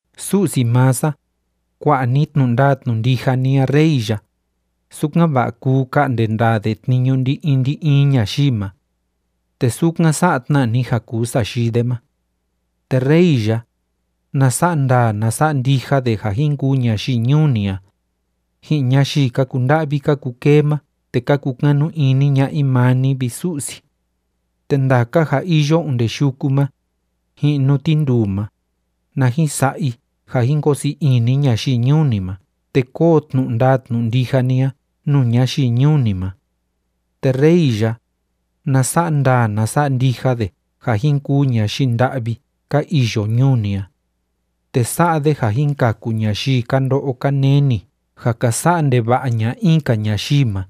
Su'si maa sa, kua'a ni tnu'u ndaa tnu'u ndija ni a rey ya, sukan‑va'a kuu ka'nde ndaa de tniñu ndi‑in ndi‑in ñayii ma. Te sukan sa'a tna ni ja kuu sayii de ma. Te rey ya, na sa'a ndaa na sa'a ndija de ja jin kuu ñayii ñuu ni a, ji'in ñayii ka kunda'vi ka kukee ma te ka kukanu ini ña'a i maa ni, vi Su'si. Te ndaka ja iyo onde yuku ma, ji'in nuu tinduu ma, na jin sa'a i ja jin koo sii ini ñayii ñuu ni ma te kóo tnu'u ndaa tnu'u ndija ni a nuu ñayii ñuu ni ma. Te rey ya, na sa'a ndaa na sa'a ndija de ja jin kuu ñayii nda'vi ka iyo ñuu ni a. Te sa'a de ja jin kaku ñayii ka ndo'o ka neni ja ka sa'a ndeva'a ña'a in‑ka ñayii ma,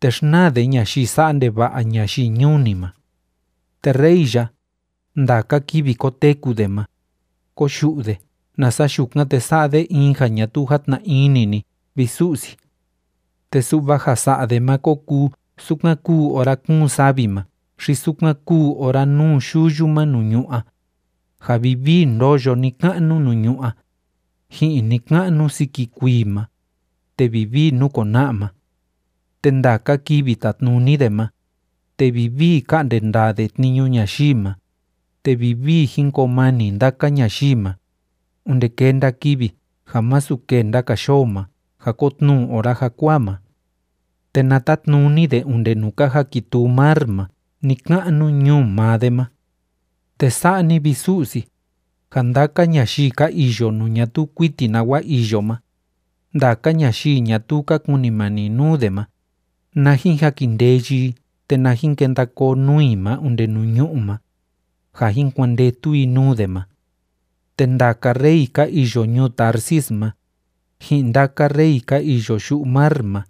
te xnaa de ñayii sa'a ndeva'a ñayii ñuu ni ma. Te rey ya, ndaka kivi koteku de ma kóyu'u de, nasa yukan, te sa'a de in ja ñatuu játna ini ni, vi Su'si. Te su'va ja sa'a de ma kó kuu sukan kúu ora kúun savi ma xi sukan kúu ora núu yuyu ma nuu ñu'ú a, ja vivii ndóyo ni‑ka'nu nuu ñu'ú a, ji'in ni‑ka'nu siki kuii ma, te vivii núkona'a ma. Te ndaka kivi tatnuni de ma, te vivii ká'nde ndaa de tniñu ñayii ma, te vivii jín koo mani ndaka ñayii ma, onde kenda kivi ja masu kenda‑ka yoo ma ja kotnuu ora jakuaa ma. Te na tatnuni de onde nuu ka jakituu mar ma ni‑ka'nu ñuu maa de ma. Te sa'a ni, vi Su'si, ja ndaka ñayii ka iyo nuu ñatuu kuiti nawa iyo ma, ndaka ñayii ñatuu ka kunimani nuu de ma, na jin jakindeyi i te na jin kenda koo nuu i ma onde nuu ñu'ú ma, ja jin kuandetu i nuu de ma. Te ndaka rey ka iyo ñuu Tarsis ma, ji'in ndaka rey ka iyo yu'u mar ma,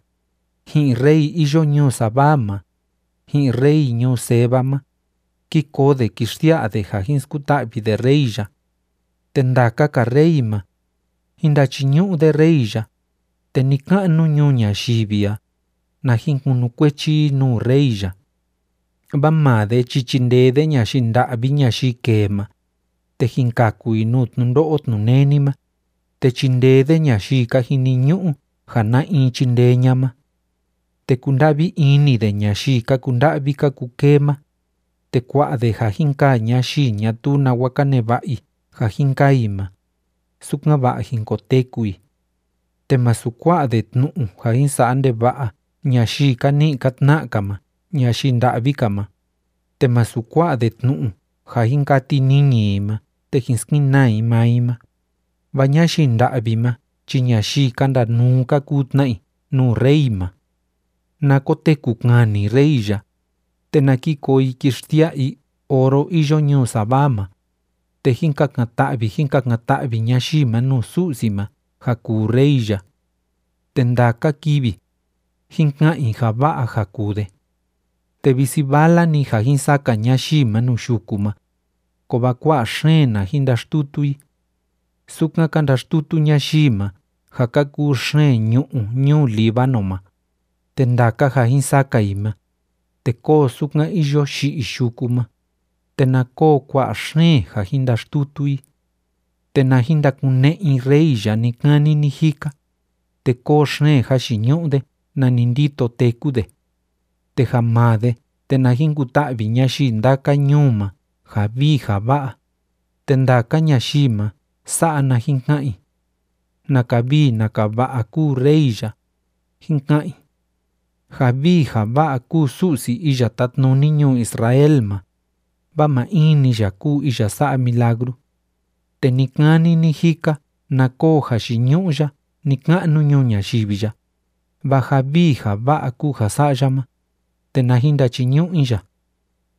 ji'in rey iyo ñuu Sabá ma, ji'in rey ñuu Seba ma, kí koo de kí xsia'a de ja jin skuta'vi de rey ya. Te ndaka‑ka rey ma, jín ndachiñu'u de rey ya, te ni‑ka'nu ñuu ñayivi a, na jin kunukuechi i nuu rey ya. Vaa maa de chi chindee de ñayii nda'vi ñayii kee ma, te jin kaku i nuu tnundo'o tnuneni ma, te chindee de ñayii ka jiniñu'u ja na in chindee ña'a ma. Te kunda'vi ini de ñayii ka kunda'vi ka kukee ma, te kua'a de ja jin kaa ñayii ñatuu nawa ka neva'a i ja jin kaa i ma, sukan‑va'a jin koteku i. Te másu kua'a de tnu'u ja jin sa'a ndeva'a ñayii ka ni'i ka tna'a‑ka ma ñayii nda'vi‑ka ma, te másu kua'a de tnu'u ja jin kati niñi i ma te jin skenaa i maa i ma, vaa ñayii nda'vi ma chi ñayii ka ndanuu ka kuu tna i nuu rey ma. Na koteku kani rey ya, te na ki koo i kí xsia'a i oro iyo ñuu Sabá ma, te jín kakan‑ta'vi jín kakan‑ta'vi ñayii ma nuu Su'si ma ja kuu rey ya. Te ndaka kivi, jín ka'an i ja va'a ja kuu de. Te visi vala‑ni ja jin saka ñayii ma nuu yuku ma, kovaa kua'a xeen na jin ndaxtutu i. Sukan ka ndaxtutu ñayii ma ja ka kuu xeen ñu'ú ñuu Líbano ma, te ndaka ja jin saka i ma, te kóo sukan iyo yi'i yuku ma, te na koo kua'a xeen ja jin ndaxtutu i. Te na jin ndakune'e i rey ya ni‑kani ni‑jika, te kóo xeen jayiñu'u de nani ndito téku de. Te ja maa de, te na jin kuta'vi ñayii ndaka ñuu ma ja vii ja va'a, te ndaka ñayii ma, sa'a na jin ka'an i: “¡Naka vii naka va'a kúu rey ya!”, jin ka'an i. Ja vii ja va'a kúu Su'si iya Tátnuni ñuu Israel ma, vaa maa in‑ni ya kúu iya sa'a milagru. Te ni‑kani ni‑jika na koo jayiñu'u ya ni‑ka'nu ñuu ñayivi ya, vaa ja vii ja va'a kúu ja sa'a ya ma, te na jin ndachiñu'u i ya.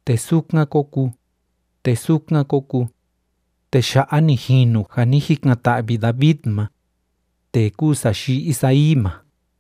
Te sukan kó kuu, te sukan kó kuu. Te ya'a ni jinu ja ni jikan‑ta'vi David ma, tee kúu sayii Isaí ma.